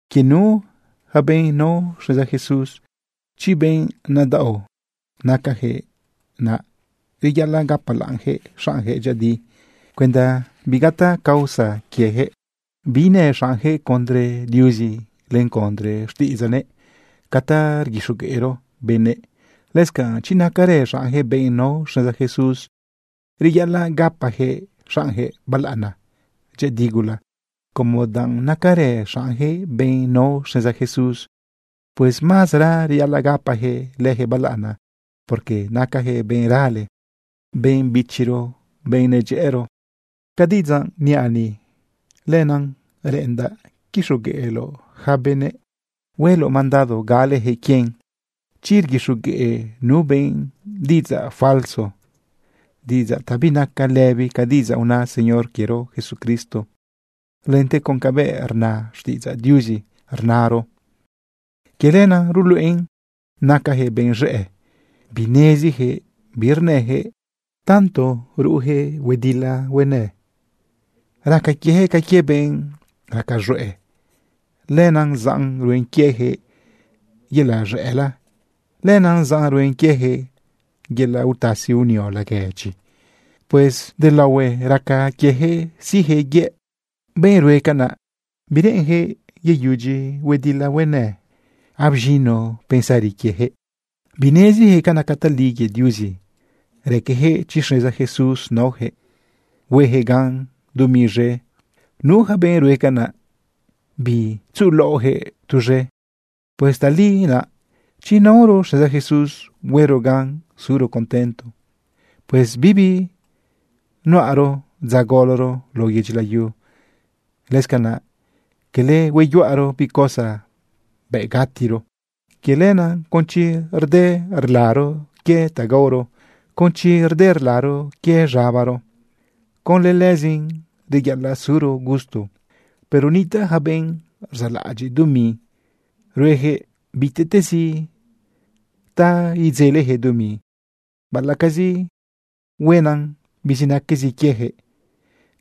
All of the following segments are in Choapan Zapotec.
Quie nu yaca benꞌ nao xneza Jesús, chi benꞌ nadaꞌo nacayaquëꞌ, naꞌ reyaꞌalaꞌ gapalaꞌnyaquëꞌ xaꞌnyaquëꞌ dyëꞌëdi cuenda bigataꞌ causa quiejëꞌ biinëꞌ xaꞌnyaquëꞌ condre Diuzi len condre xtiꞌidzaꞌnëꞌ ca ta rguixogueꞌro benëꞌ. Lëscanꞌ chi nacarë xaꞌnyaquëꞌ benꞌ nao xneza Jesús, reyaꞌalaꞌ gapayaquëꞌ xaꞌnyaquëꞌ balaꞌana dyëꞌëdi gula como danꞌ nacarë xaꞌnyaquëꞌ benꞌ nao xneza Jesús. Pues mazara reyaꞌalaꞌ gapayaquëꞌ leyaquëꞌ balaꞌana, porque nacayaquëꞌ benꞌ rale, benꞌ bichiro, benꞌ nedyëꞌëro. Ca diꞌidzaꞌ niaꞌ ni, lenaꞌ reꞌendaꞌ quixogueꞌloꞌ yaca benëꞌ hueloꞌ mandado galeyaquëꞌ quien. Chi rguixogueꞌ nu benꞌ diꞌidzaꞌ falso, diꞌidzaꞌ ta binaca lëbi ca diꞌidzaꞌ una Señor quiero Jesucristo lente con cabëꞌ rna xtiꞌidzaꞌ Diuzi rnaoro, quie lenaꞌ ruluꞌen nacayaquëꞌ benëꞌ z̃ëꞌ bineziyaquëꞌ bi rnëyaquëꞌ. Tanto ruꞌuyaquëꞌ huedila huenë, raca quieyaquëꞌ ca quie benꞌ raca z̃hueꞌ. Lenaꞌ zaꞌn ruen quiejëꞌ yelaꞌ z̃ëꞌla. Lenaꞌ zaꞌn ruen quieyaquëꞌ yelaꞌ utasi unio laguedyi. Pues delaohue raca quiejëꞌ siꞌjëꞌ yëꞌ. Yaca benꞌ rue canaꞌ, bireꞌenyaquëꞌ yeyudyi huedila huenë, abz̃ino pensari quieyaquëꞌ. Bineziyaquëꞌ ca naca tali quie Diuzi. Raqueyaquëꞌ chi xneza Jesús naoyaquëꞌ, hueyaquëꞌ gan dumi z̃e. Nu yaca benꞌ rue canaꞌ, bitzuꞌulaoꞌjëꞌ tuz̃e. Pues tali naꞌ chi naoro xneza Jesús huero gan suro contento. Pues bibi nuꞌaro dza goloro lao yedyi layu. Lëscanaꞌ quele hueyuꞌaro bi cosa bëꞌ gatiro. Quie lenaꞌ con chi rde rlaro quie ta gaoro, con chi rde rlaro quie z̃abaro, conlë lëzin reyaꞌalaꞌ zuro gusto. Pero nitaꞌ yaca benꞌ rzaꞌlaꞌadyiꞌ dumi. Rueyaquëꞌ bitezi ta idzeleyaquëꞌ dumi, baꞌalaꞌcazi huenan bizinaquezi quieyaquëꞌ.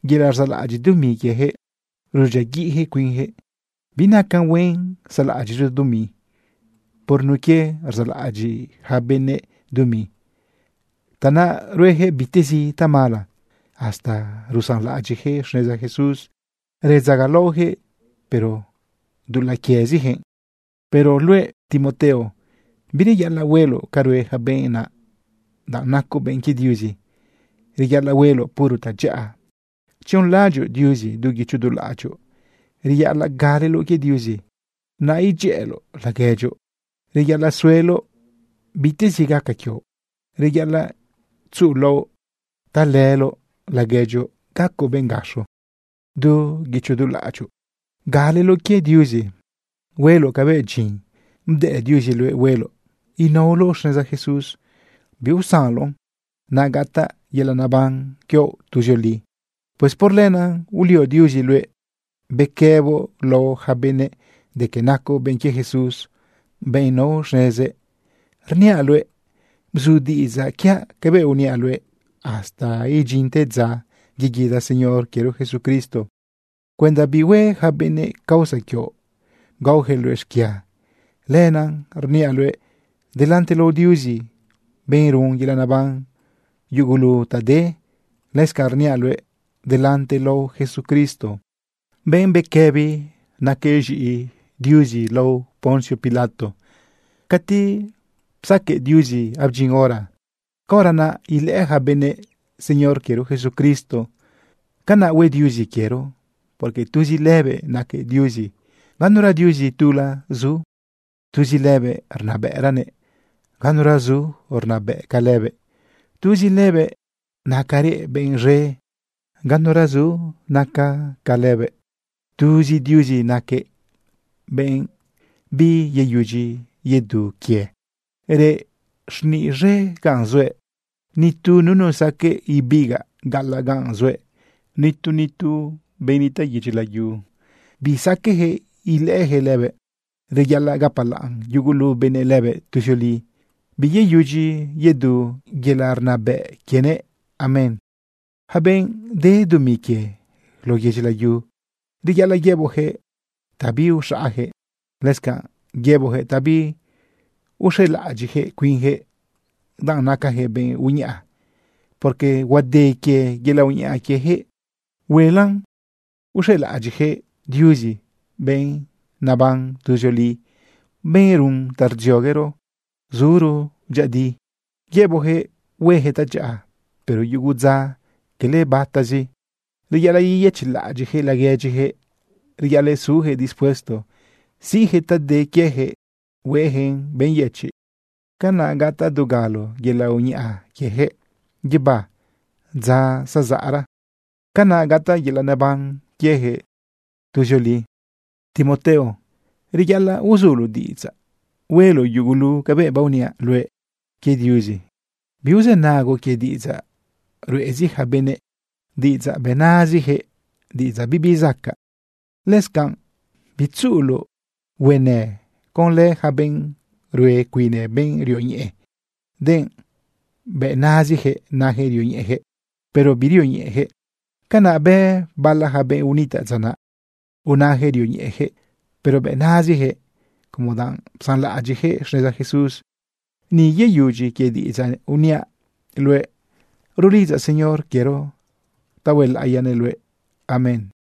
Yelaꞌ rzaꞌlaꞌadyiꞌ dumi quieyaquëꞌ, rudyiaguiꞌyaquëꞌ cuinyaquëꞌ. Binacan huen saꞌlaꞌadyiꞌro dumi. Por nun quie rzaꞌlaꞌadyiꞌ yaca benëꞌ dumi, tanaꞌ rueyaquëꞌ bitezi tamala, hasta rusanlaꞌadyiꞌyaquëꞌ xneza Jesús redzagalaoyaquëꞌ, pero dulaꞌ quieziyaquëꞌ. Pero luëꞌ, Timoteo, bireyaꞌalaꞌ hueloꞌ ca rue yaca benꞌ naꞌ, danꞌ nacoꞌ benꞌ quie Diuzi. Reyaꞌalaꞌ hueloꞌ puro tadyaꞌa tzionlaꞌadyoꞌ Diuzi du guicho du laꞌadyoꞌ. Reyaꞌalaꞌ galeloꞌ quie Diuzi, naꞌ idyëꞌëloꞌ laguedyoꞌ. Reyaꞌalaꞌ sueloꞌ bitezi gaca quioꞌ. Reyaꞌalaꞌ tzuꞌulaoꞌ talëloꞌ laguedyoꞌ gacoꞌ benꞌ gaxo. Du guicho du laꞌadyoꞌ galeloꞌ quie Diuzi hueloꞌ cabëꞌ dyin bdëꞌ Diuzi luëꞌ hueloꞌ. Inaoloꞌ xneza Jesús biusanloꞌn, naꞌ gataꞌ yelaꞌ neban quioꞌ tuzioli. Pues por lenaꞌ ulio Diuzi luëꞌ bequëboꞌ lao yaca benëꞌ de que nacoꞌ benꞌ quie Jesús, benꞌ nao xnezëꞌ. Rniaꞌ luëꞌ: Bzu diꞌidzaꞌ quiaꞌ cabëꞌ uniaꞌ luëꞌ hasta idyinte dza yeguida Señor quiero Jesucristo cuenda bihue yaca benëꞌ causa quioꞌ gaojëꞌ luëꞌ xquia. Lenaꞌ rniaꞌ luëꞌ delante lao Diuzi, benꞌ run yelaꞌ neban yugulu ta de. Lëscanꞌ rniaꞌ luëꞌ delante lao Jesucristo, benꞌ bequëbi naquëꞌ z̃iꞌi Diuzi lao Poncio Pilato. Cati psaqueꞌ Diuzi abdyin hora, caora naꞌ ilëꞌë yaca benëꞌ Señor quiero Jesucristo. Canaꞌ hue Diuzi quiero, porque tuzi lëbëꞌ naquëꞌ Diuzi, ganura Diuzi tula zu. Tuzi lëbëꞌ rnabëꞌranëꞌ. Ganura zu rnabëꞌ ca lëbëꞌ. Tuzi lëbëꞌ nacarëꞌ benꞌ z̃e. Ganura zu naca ca lëbëꞌ. Tuzi Diuzi naquëꞌ benꞌ biyeyudyi yedu quie. Reꞌ xniꞌ z̃e gaꞌn zuëꞌ. Nitu nunu saqueꞌ ibigaꞌ gaꞌalaꞌ gaꞌn zuëꞌ. Nitu nitu benꞌ nitaꞌ yedyi layu bisaqueꞌjëꞌ ilëꞌëjëꞌ lëbëꞌ. Reyaꞌalaꞌ gapalaꞌn yugulu benëꞌ lëbëꞌ tuzioli. Biyeyudyi yedu yelaꞌ rnabëꞌ quienëꞌ. Amén. Yaca benꞌ de dumi quie lao yedyi layu, reyaꞌalaꞌ yëboꞌjëꞌ ta biuxaꞌajëꞌ. Lëscanꞌ yëboꞌjëꞌ ta biuxelaꞌadyiꞌjëꞌ cuinjëꞌ danꞌ nacajëꞌ benꞌ uñaꞌa, porque huade quie yelaꞌ uñaꞌa quiejëꞌ. Huenla uxelaꞌadyiꞌyaquëꞌ Diuzi, benꞌ naban tuzioli, benꞌ run ta rdzioguero suro dyëꞌëdi. Yëboꞌjëꞌ huejëꞌ tadyaꞌa, pero yugu dza quele batazi. Reyaꞌalaꞌ yeyëchiꞌlaꞌadyiꞌyaquëꞌ laguedyiyaquëꞌ. Reyaꞌalaꞌ suyaquëꞌ dispuesto siꞌjëꞌ ta de quieyaquëꞌ hueꞌyaquëꞌn benꞌ yëchiꞌ. Canaꞌ gataꞌ dugalo yelaꞌ uñaꞌa quieyaquëꞌ guibá dza zazaꞌra. Canaꞌ gataꞌ yelaꞌ neban quieyaquëꞌ tuzioli. Timoteo, reyaꞌalaꞌ uzuloꞌ diꞌidzaꞌ hueloꞌ yugulu cabëꞌ baoniaꞌ luëꞌ quie Diuzi. Biuzënagoꞌ quie diꞌidzaꞌ ruꞌezi yaca benëꞌ, diꞌidzaꞌ bëꞌ nazijëꞌ, diꞌidzaꞌ bibi zacaꞌ. Lëscanꞌ bitzuꞌuloꞌ huenë conlë yaca benꞌ rue cuine benꞌ rioñeꞌe, denꞌ bëꞌ nazijëꞌ najëꞌ rioñeꞌeyaquëꞌ, pero birioñeꞌeyaquëꞌ. Canaꞌ bë bala ja benꞌ unitaꞌ dza naꞌ. Unayaquëꞌ rioñeꞌeyaquëꞌ, pero bëꞌ naziyaquëꞌ, como danꞌ psanlaꞌadyiꞌyaquëꞌ xneza Jesús. Ni yeyudyi quie diꞌidzaꞌ uniaꞌ luëꞌ. Rulidzaꞌ Señor quiero ta huelaꞌiyanëꞌ luëꞌ. Amén.